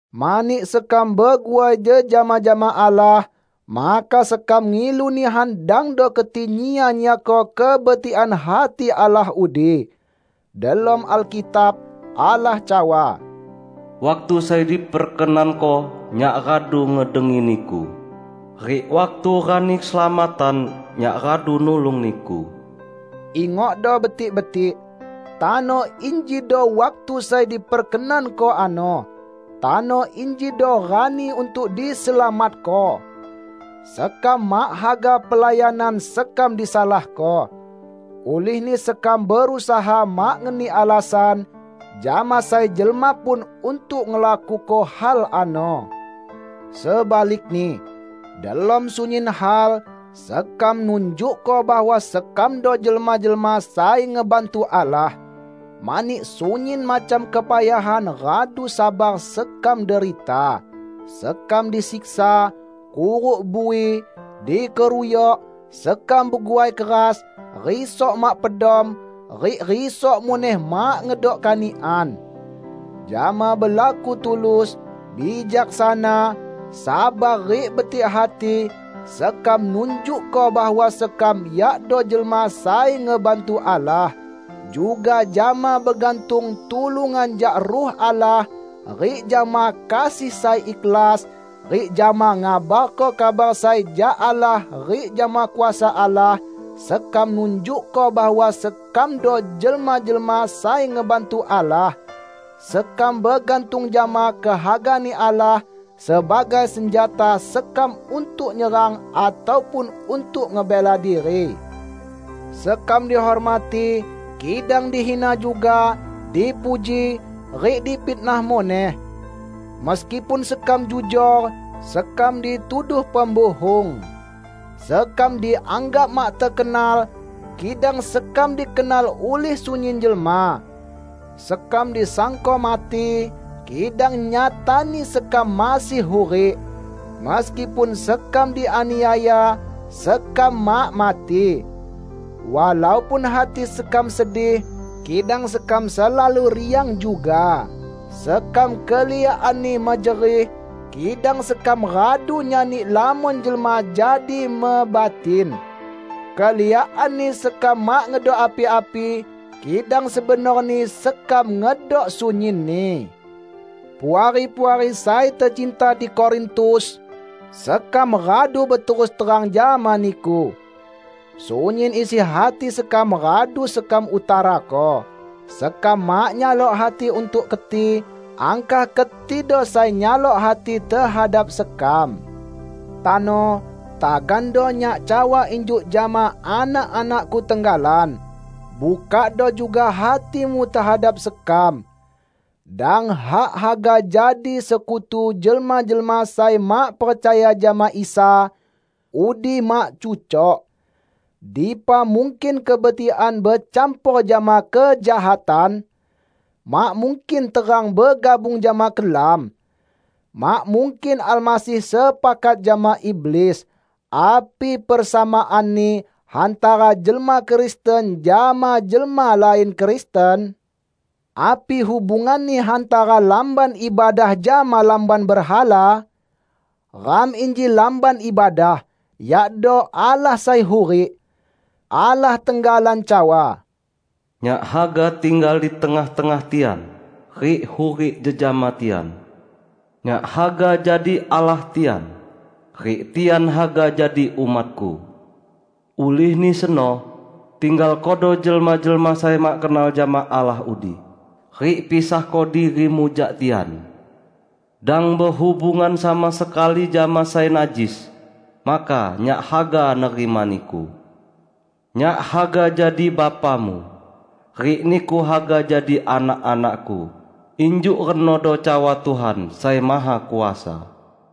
Mani sekam beguai jejama jama Allah, maka sekam ngilu nihan dangdo keti nyia-nyiako kebetikan hati Allah udi. Delom Alkitab, Allah cawa, "Waktu sai diperkenanko, Nyak radu ngedengi niku, rik waktu rani keselamatan, Nyak radu nulung niku." Ingokdo betik-betik, tano injido waktu sai diperkenanko ano. Tano injido rani untuk diselamatko! Sekam mak haga pelayanan sekam disalahko. Ulihni sekam berusaha mak ngeni alasan jama sai jelma pun untuk ngelakuko hal ano. Sebalikni, delom sunyin hal, sekam nunjukko bahwa sekamdo jelma-jelma sai ngebantu Allah. Mani, sunyin macam kepayahan radu sabar sekam derita: sekam disiksa, kuruk bui, dikeruyok; sekam beguai keras, risok mak pedom rik risok muneh mak ngedok kanikan. Jama belaku tulus, bijaksana, sabar rik betik hati, sekam nunjukko bahwa sekam yakdo jelma sai ngebantu Allah. Juga jama begantung tulungan jak Ruh Allah, rik jama kasih sai ikhlas, rik jama ngabarko kabar sai jak Allah rik jama kuasa Allah, sekam nunjukko bahwa sekamdo jelma-jelma sai ngebantu Allah. Sekam begantung jama kehaga-Ni Allah sebagai senjata sekam untuk nyerang ataupun untuk ngebela diri. Sekam dihormati, kidang dihina juga; dipuji, rik difitnah muneh. Meskipun sekam jujor, sekam dituduh pembuhung. Sekam dianggap mak tekenal, kidang sekam dikenal ulih sunyin jelma. Sekam disangko mati, kidang nyatani sekam masih hurik. Meskipun sekam dianiaya, sekam mak mati. Walaupun hati sekam sedih, kidang sekam selalu riang juga. Sekam keliakanni mejerih, kidang sekam radu nyani lamon jelma jadi mebatin. Keliakanni sekam mak ngedok api-api, kidang sebenorni sekam ngedok sunyinni. Puari-puari sai tecinta di Korintus! Sekam radu beterus terang jama niku. Sunyin isi hati sekam radu sekam utarako. Sekam mak nyalok hati untuk keti, angkah ketido sai nyalok hati tehadap sekam. Tano, tagando nyak cawa injuk jama anak-anakku tenggalan. Bukakdo juga hatimu tehadap sekam. Dang hak haga jadi sekutu jelma-jelma sai mak percaya jama Isa; udi mak cucok. Dipa mungkin kebetikan becampor jama kejahatan! Mak mungkin terang begabung jama kelam. Mak mungkin Almasih sepakat jama iblis. Api persamaanni hantara jelma Kristen jama jelma lain Kristen? Api hubunganni hantara Lamban Ibadah jama lamban berhala? Ram inji Lamban Ibadah, yakdo Allah sai hurik. Allah tenggalan cawa, "Nyak haga tinggal di tengah-tengah tian, rik hurik jejama tian. Nyak haga jadi Allah tian, rik tian haga jadi umat-Ku. Ulihni seno, tinggalkodo jelma-jelma sai mak kenal jama Allah udi, rik pisahko dirimu jak tian. Dang behubungan sama sekali jama sai najis, maka Nyak haga nerima niku. Nyak haga jadi Bapamu, rik niku haga jadi anak-anak-Ku, injuk renodo cawa Tuhan Sai Mahakuasa."